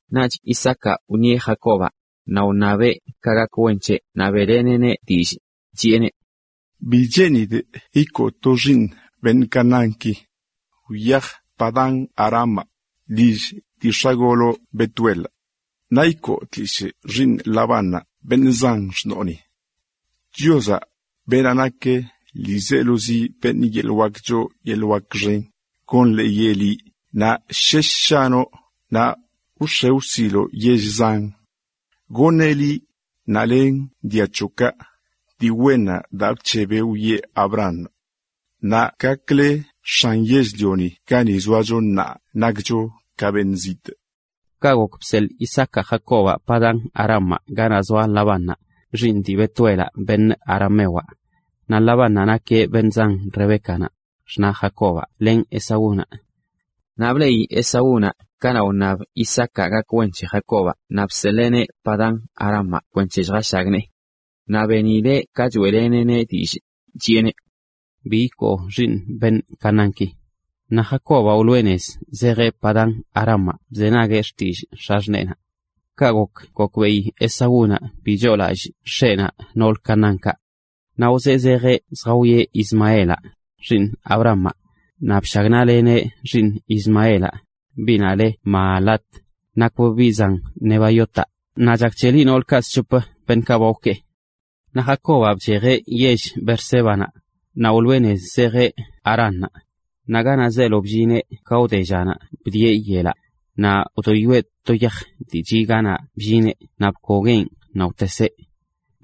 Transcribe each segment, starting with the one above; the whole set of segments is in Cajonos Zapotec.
Naꞌch Isaacaꞌ wṉieꞌ Jacobaꞌ, naꞌ wṉabeꞌ ka gak wen c̱heꞌ naꞌ beꞌleneꞌneꞌ dillꞌ, chiꞌeneꞌ: ―Bi cheenidꞌ ikoo to xiiṉ beṉꞌ Canaánki. Wyaj Padán-arámaꞌ, lill dii x̱agoloꞌ Betuelaꞌ. Naꞌ ikoo tlishꞌ xiiṉ Labánnaꞌ, beṉꞌ zan xṉoonaꞌ. Chiozaꞌ, beenaꞌ nak ḻiizelozi beṉꞌ yeḻꞌ wak choo yeḻꞌ wak xen, gonḻeeyeꞌ liꞌ naꞌ shesh shanoꞌ naꞌ wx̱e wsiloꞌ yell zan. Goṉeꞌ liꞌ len dia c̱hoꞌkaꞌ dii wennaꞌ daa bc̱hebeꞌ wiꞌe Abrahamaꞌ. Naꞌ gakle x̱an yell-lioni gani zoacho ka beṉꞌ zitꞌ. Ka gok bseḻꞌ Isaacaꞌ Jacobaꞌ Padán-arámaꞌ ganaꞌ zoa Labánnaꞌ, xiiṉ dii Betuelaꞌ beṉꞌ aramewaꞌ. Naꞌ Labánnaꞌ nakeꞌ beṉꞌ zan Rebécanaꞌ, xṉaꞌ Jacobaꞌ len Esaúnaꞌ. Naꞌ bleꞌi Esaúnaꞌ ka wṉab Isaacaꞌ gak wen c̱he Jacobaꞌ naꞌ bseḻeeneꞌ Padán-arámaꞌ kwenc̱he lljashagnee. Naꞌ benileꞌ ka choeꞌleneꞌneꞌ dillꞌ, chiꞌeneꞌ: “Bi ikoo xiiṉ beṉꞌ Canaánki.” Naꞌ Jacobaꞌ wloꞌe nez zejeꞌ Padán-arámaꞌ bzenagueꞌ xtillꞌ x̱axṉeekaꞌ. Kaꞌ gok gokbeꞌi Esaúnaꞌ bi choolallꞌ x̱eꞌnaꞌ noolə Canaánkaꞌ. Naꞌ wzee zejeꞌ zjawieꞌ Ismaelaꞌ, xiiṉ Abrahamaꞌ, naꞌ bshagnaꞌleneꞌ xiiṉ Ismaelaꞌ, biꞌnaꞌ le Mahalat, nakbꞌ biꞌ zan Nebaiotaꞌ, naꞌ chak c̱heli noolkaꞌ sc̱hop( zi c̱hop) beṉꞌkaꞌ ba wkee. Naꞌ Jacobaꞌ bchejeꞌ yell Beersébanaꞌ, naꞌ wloꞌe nez zejeꞌ Haránnaꞌ. Naꞌ ganaꞌ zeelo bllineꞌ ka wde llanaꞌ bdieꞌ yelaꞌ. Naꞌ wdoyoeꞌ to yaj dii chiꞌ ganaꞌ bllineꞌ naꞌ bkogueꞌn naꞌ wteseꞌ.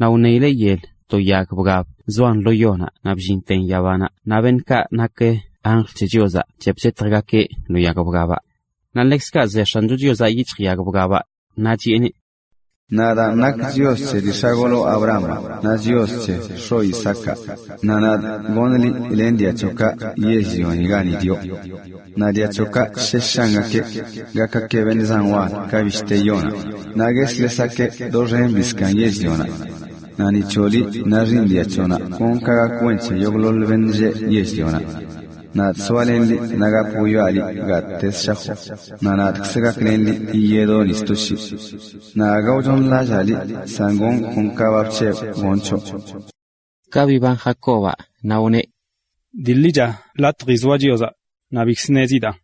Naꞌ wṉeileꞌ yel to yag bgab zoan lo yonaꞌ naꞌ bllinten yabanaꞌ naꞌ beṉꞌkaꞌ nak anjl c̱he Chiozaꞌ chep chetjgakeꞌ lo yag bgabaꞌ. Naꞌ ḻekzkaꞌ ze X̱ancho Chiozaꞌ yic̱hj yag bgabaꞌ, naꞌ chiꞌeneꞌ: “Nadaan nakꞌ Chios c̱he dii x̱agoloꞌ Abrahamaꞌ naꞌ Chios c̱he x̱oꞌ Isaacaꞌ, naꞌ nadꞌ goṉꞌ liꞌ len dia c̱hoꞌkaꞌ yell-lioni gani dioꞌ. Naꞌ dia c̱hoꞌkaꞌ shesh shangakeꞌ, gakgakeꞌ beṉꞌ zan wal ka bishte yonaꞌ, naꞌ gueslesgakeꞌ doxen zbii zkaaṉ yell-lioni. Naꞌ ni c̱hoꞌ liꞌ naꞌ xiiṉ dia c̱hoꞌnaꞌ gonꞌ ka gak wen c̱he yogꞌḻoḻ beṉꞌ lleꞌ yell-lioni. Nadꞌ zoalenꞌ liꞌ naꞌ gap wwiaꞌ liꞌ gattezə shajoꞌ, naꞌ nadkzꞌ gaklenꞌ liꞌ yiyedoꞌ ni sto shii. Naꞌ aga wchooṉlallaa liꞌ san gonꞌ kon ka ba bc̱hebꞌ gonꞌ c̱hoꞌ.” Ka biban Jacobaꞌ naꞌ wneꞌ: “Dii ḻicha latji zoa Chiozaꞌ, naꞌ bikzə ṉezidanꞌ.”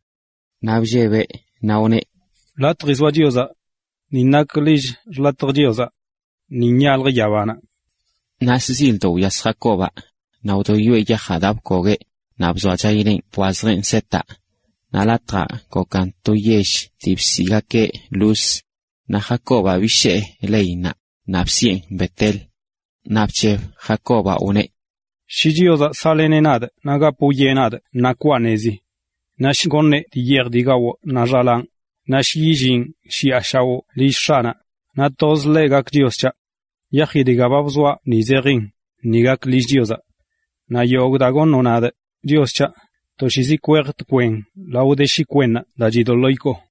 Naꞌ bllebeꞌ, naꞌ wneꞌ: “Latji zoa Chiozaꞌ. Ni nak lill xḻatjə Chiozaꞌ. ¡Ni nyaljə yabanaꞌ!” Naꞌ shzildoꞌ wyas Jacobaꞌ, naꞌ wdoyoeꞌ yajaꞌ daa bkogueꞌ, naꞌ bzoachayileꞌn bwazjeꞌn setaꞌ. Naꞌ latjaꞌ gokan to yell dii bsiꞌgakeꞌ Luz naꞌ Jacobaꞌ bishee leinnaꞌ naꞌ bisiꞌen Bet-el.a Naꞌ bc̱heb Jacobaꞌ wneꞌ: “Shi Chiozaꞌ saꞌleneꞌ nadꞌ naꞌ gap wwieꞌ nadꞌ ṉaa kwaa nezi, naꞌ shi goṉeꞌ dii yeej gawꞌ naꞌ xalaanꞌ, naꞌ shi yillinꞌ shiꞌa shaoꞌ lill x̱aꞌnaꞌ, naꞌ tozeꞌ ḻeꞌ gakeꞌ Chios c̱haꞌ. Yaji dga ba bzoaꞌ ni zejin nin gak lill Chiozaꞌ. Naꞌ yogꞌ daa goṉoꞌ nadꞌ, Chios c̱haꞌ, toshiizi kwejꞌ tkwen lao de shi kwennaꞌb daa chidoḻoo ikoo.”